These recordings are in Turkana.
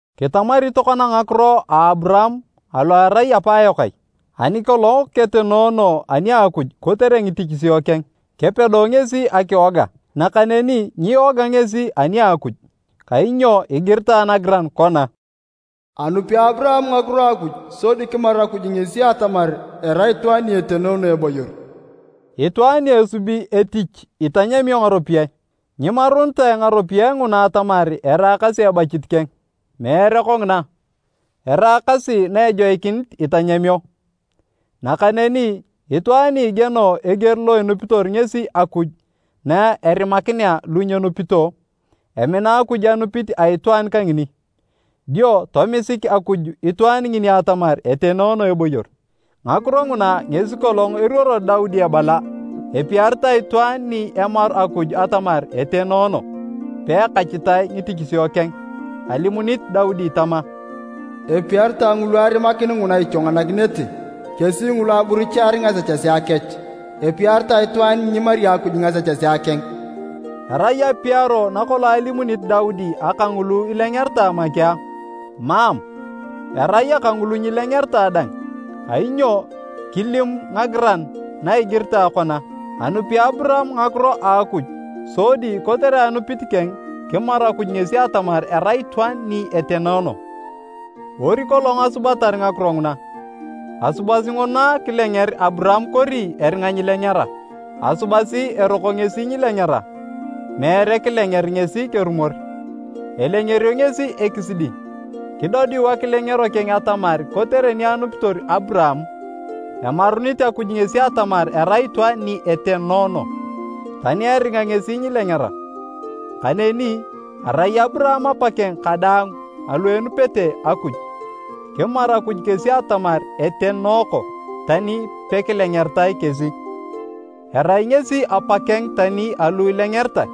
Kitamari tokona ngakiro a Aburaam alo erai apaayok ai? Ani kolong ketenoono ani a Akuj kotere ngitichisio keng, kepedo ngesi akiwoga, nakaneni nyiwoga ngesi ani a Akuj. Kainyo igiritae nagiran kona, “Anupi Aburaam ngakiro a Akuj sodi kimaru Akuj ngesi atamar erai itwaan ni etenoono eboyor.” Itwaan ni esubi etich itanyamio ngaropiyae. Nyimarunitae ngaropiyae nguna atamar eraakasi ebachit keng. Meere kongina, eraakasi na ejoikinit itanyamio. Nakaneni itwaan ni igieno eger lo enupitor ngesi Akuj na erimakinea lu nyenupito, emina Akuj anupit a itwaan kangini. Dio tomisik Akuj itwaan ngini atamar etenoono eboyor. Ngakiro nguna ngesi kolong eruoro Daudi ebala epiaritae itwaan ni emaru Akuj atamar etenoono, peekachitae ngitichisio keng. Alimunit Daudi tama, “Epiaritae ngulu arimakin nguna ichwanganakinete, kesi ngulu aburuchiar ngasechesea kech! Epiaritae itwaan ni nyimari Akuj ngasechesea keng!” Erai apiaro nakolong alimit Daudi aka ngulu ilengeritae make a? Mam! Erai aka ngulu nyilengeritae dang. Kainyo kilimu ngagiran na igiritae kona, “Anupi Aburaam ngakiro a Akuj, sodi kotere anupit keng, kimaru Akuj ngesi atamar erai itwaan ni etenoono.” Ori kolong asubatar ngakiro nguna? Asubasi nguna kilenger Aburaam kori eringa nyilengera? Asubasi eroko ngesi nyilengera, meere kilenger ngesi kerumor. Elengerio ngesi ekisidi, kidodiu akilengero keng atamar kotere ni anupitor Aburaam, emarunit Akuj ngesi atamar erai itwaan ni etenoono, tani eringa ngesi nyilengera. Kaneni, arai Aburaam apakeng kadaang alu enupete Akuj, kimaru Akuj kesi atamar etenooko, tani pekilengeritae kesi. Erai ngesi apakeng tani alu ilengeritae,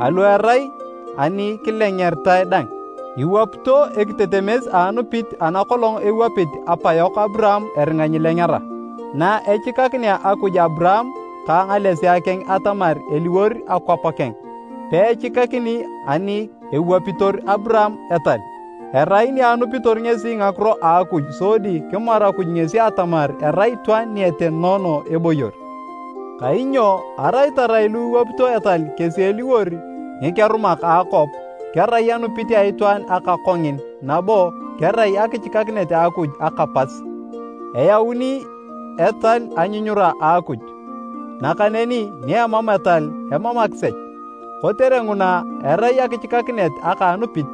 alu erai ani kilengeritae dang, iwapito ekitetemes a anupit ana kolong ewapit apayok Aburaam eringa nyilengera. Na echikakinea Akuj Aburaam ka ngalesea keng atamar eliwor akwap akeng, peechikakini ani ewapitor Aburaam etal, erai ni anupitor ngesi ngakiro a Akuj sodi kimaru Akuj ngesi atamar erai itwaan ni etenoono eboyor. Kainyo arai tarai lu iwapito etal kesi eliwor ngikerumak akwap, kerai anupit a itwaan aka kongin nabo kerai akichikakinet a Akuj aka pas. Eyauni etal anyunyura a Akuj, nakaneni ni emam etal, emam akisech. Kotere nguna, erai akichikakinet aka a anupit,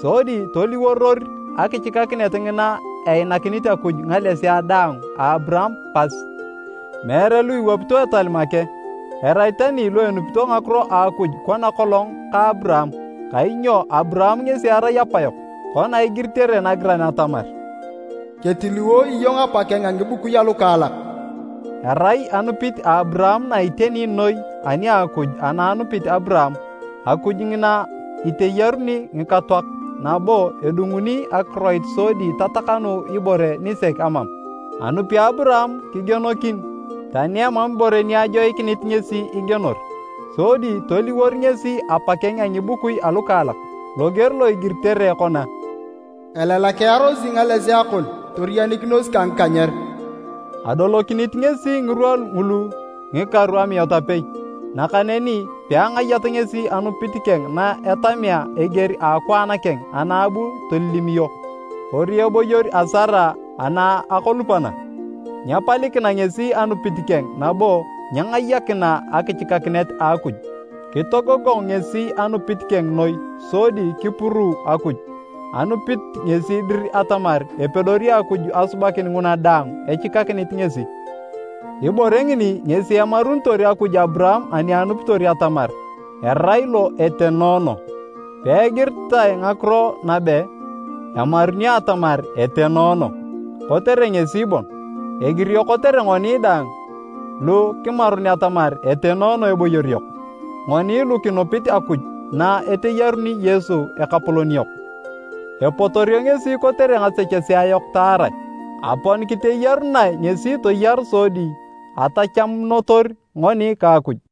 sodi toliworor akichikakinet ngina einakinit Akuj ngalesea daang a Aburaam pas, meere lu iwapito etal make, erai tani lu enupito ngakiro a Akuj kona kolong ka Aburaam, kainyo Aburaam ngesi erai apayok, kona igiritere nagiran atamar, “Ketiliwo iyong apa keng a ngibukui alukaalak.” Erai anupit a Aburaam na iteni noi ani a Akuj ana anupit Aburaam, Akuj ngina iteyaruni ngikatoak nabo edunguni akiroit sodi tatakanu ibore nisek amam. Anupi Aburaam kigienokin, tani emam ibore ni ajoikinit ngesi igienor, sodi toliwor ngesi apakeng a ngibukui alukaalak. Loger lo igiritere kona, “Elalakearosi ngalesea kon toriyanikinos ka ngikanyer.” Adolokinit ngesi ngirwa ngulu ngikaru amiat apei. Nakaneni peangayat ngesi anupit keng na etamea eger a akwaan keng ana abu tolilimiyo, kori eboyor a Sara ana akolupana. Nyepalikina ngesi anupit keng nabo nyengayakina akichikakinet a Akuj. Kitogogong ngesi anupit keng noi sodi kipuruu Akuj. Anupit ngesi dir atamar epedori Akuj asubakin nguna daang echikakinit ngesi. Ibore ngini ngesi emarunitor Akuj Aburaam ani anupitor atamar, “Erai lo etenoono.” Peegiritae ngakiro nabe, “Emarunio atamar etenoono” kotere ngesi bon. Egirio kotere ngoni dang lu kimarun atamar etenoono eboyor yok. Ngoni lu kinupit Akuj na eteyaruni Yesu Ekapolon yok. Epotorio ngesi kotere ngasechesea yok taarae. Aponi kiteyarunae ngesi toyar sodi atachamunotor ngoni ka Akuj.